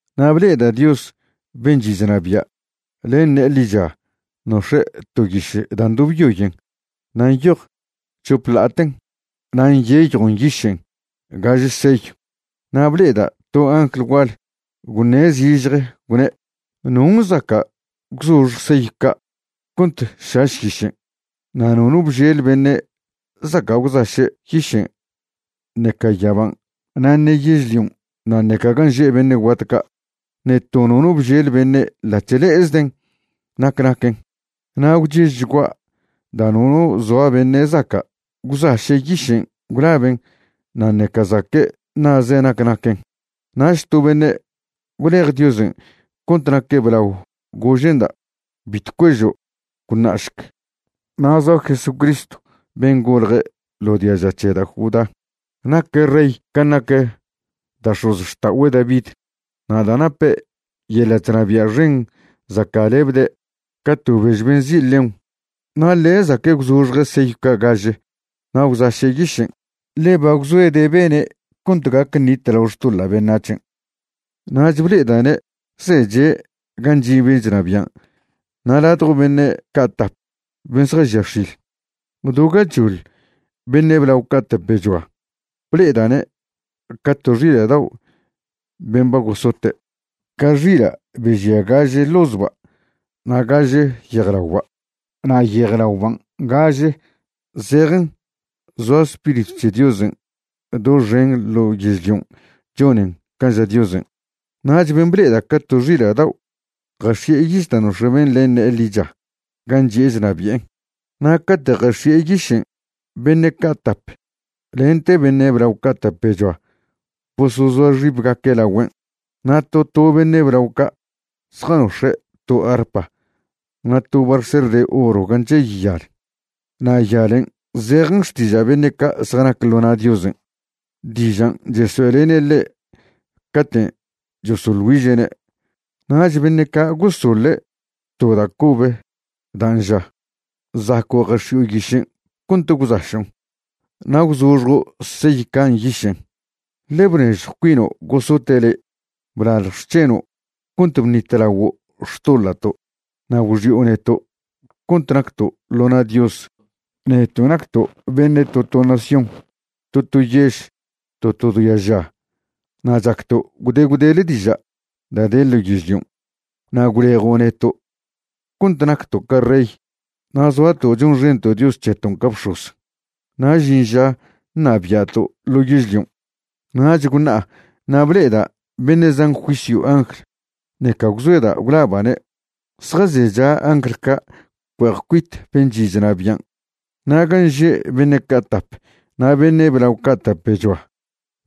Na' ble'eda' Dios ben' chi' chnabia', len ne'e ḻicha nox̱e' to yiš da' ndobyoyen na' nyoj chop ḻa'aten na' nyeyjon nyišen' gaže seyw. Na' ble'eda' to angl gual gwṉe' zižje gwne': ―¿Non' zaca' gwzoxj seyw ca' cont šaš yišen'? Na' nono bžel beṉe' zaca' gwzaše' yišen' ṉeca yaban' na' ṉe yežlion' na' ṉeca gan' že' beṉe' guat ca'. Ṉe to nono bžel beṉe' ḻa'c̱h le'ezden' nac naquen. Na' gwchežchgua' da' nono zoa beṉe' zaca' gwzaše' yišen' gwlaben' na' ṉeca zaque' ṉa'ze' nac naquen. Nach to beṉe' gwlej Diosen' cont naque' blao gože'nda': ―Bitw cuežo'. Gwṉa'šc, na' zoa Jesucristw ben' golje ḻo diaža c̱he da' Judá, naque' rey can' nac da' x̱ozxta'ogüe' David, na' da' nape' yeḻa' chnabia' xen zaca'lebde' ca to bež be nzi' león. Na' ḻe' zaque' gwzoxje' seyw ca' gaže na' gwzaše' yišen', ḻe ba gwzoede' bene' cont gac ṉitlao xtoḻa' beṉac̱hen'. Nach ble'eda'ne' zeche' gan' chi' ben' chnabian' na' ladjo beṉe' ca' tap ben' zjažia x̱il, do gachoḻ beṉe' blao ca' tapechoa. Ble'eda'ne' ca to xila' dao' ben' ba gosote', ca xila' be žia gaže ḻozba' na' gaže yejlaoba'. Na' yejlaoban' gaže zejen zoa Spiritw c̱he Diosen' doxen ḻo yežlion' chonen can' ža Diosen'. Nach ben' ble'eda' ca to xila' dao' jax̱i'e yiš dan' nox̱e' ben' len ne'e ḻicha gan' chi'e chnabi'en. Na' cate' jax̱i'e yišen' beṉe' ca' tap lente beṉe' blao ca' tapechoa bosozoa xibgaque' lagüen'. Na' to to beṉe' blao ca' zjanox̱e' to arpa na' to barser de oro gan' chey yal, na' yalen' zejen xtiža' beṉe' ca' zjanac ḻo na' Diosen', dižan' chesoe'lene' ḻe' caten' chosoḻ güiže'ne'. Nach beṉe' ca' gosoḻe' to da' cobe dan' ža: Zaco' jax̱i'o yišen' cont gwzašon' na' gwzoxjo' seyw ca' nyišen', ḻe bnežjw cuino' gosote' le'. Blalj xc̱heno' cont bṉitlaguo' xtoḻa'to', na' gwxi'o neto' cont nacto' ḻo na' Dios, neto' nacto' beṉe' to to nación, to to yež, to to diaža na' chacto' gwde gwdele diža' da' de ḻo yežlion'. Na' gwlejo' neto' cont nacto' ca rey, na' zoato' chonxento' Dios c̱heton' ca bx̱oz, na' žin ža ṉabia'to' ḻo yežlion'. Nach gwṉa'a na' ble'eda' beṉe' zan juisyw angl, ṉeca gwzoeda' gwlaba'ne'. Zjazecha angl ca' cue'ej cuit ben' chi' chnabian' na' gan' že' beṉe' ca' tap na' beṉe' blao ca' tapechoa.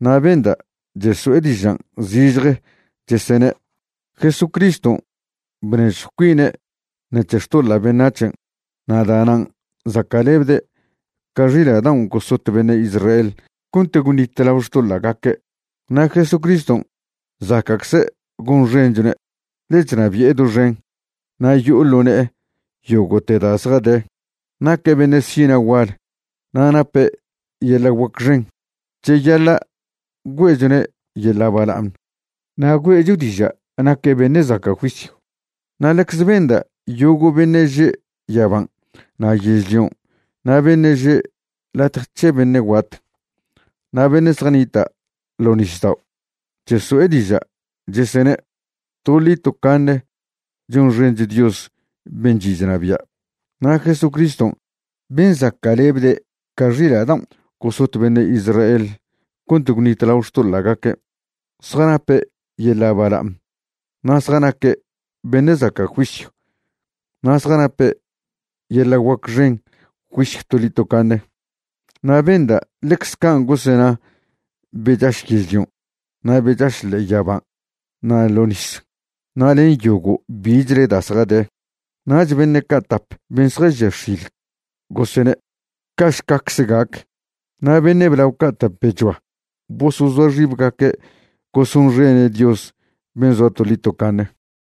Na' benda' cheso'e dižan' zižje chesene': Jesucriston' bnežjw cuine' ṉec̱he xtoḻa' beṉac̱hen', na' da'nan' zaca'lebde' ca xila' daon' gosot beṉe' Israel cont gwṉitlao xtoḻa'gaque'. Na' Jesucriston' zaca'cze' gonxenchone', ḻe chnabi'e doxen, na' yo'o ḻo ne'e yogo'te da' zjade. Naque' beṉe' sina' gual, na' nape' yeḻa' guac xen. Cheyaḻa' güe'chone' yeḻa' bala'aṉ, na' güe'cho diža' naque' beṉe' zaca' juisyw. Na' ḻecze benda' yogo' beṉe' že' yaban' na' yežlion' na' beṉe' že' latje c̱he beṉe' guat, na' beṉe' zjanita' ḻo nisdao', cheso'e diža' chesene': Toḻi tocaṉe chonxencho Dios ben' chi' chnabia' na' Jesucriston' ben' zaca'lebde' ca xila' daon' gosot beṉe' Israel cont gwṉitlao xtoḻa'gaque'. Zjanape' yeḻa' bala'aṉ, na' zjanaque' beṉe' zaca' juisyw, na' zjanape' yeḻa' guac xen juisyw toḻi tocaṉe. Na' benda' ḻecze can' gosena be chaš yežlion' na' be chaš le'e yaban' na' ḻo' nis, na' len yogo' bichle da' zjade. Nach beṉe' ca' tap ben' zjažia x̱il gosene': ―Ca'šcacze gac. Na' beṉe' blao ca' tapechoa bosozoa xibgaque' gosonxene' Dios ben' zoa toḻi tocaṉe.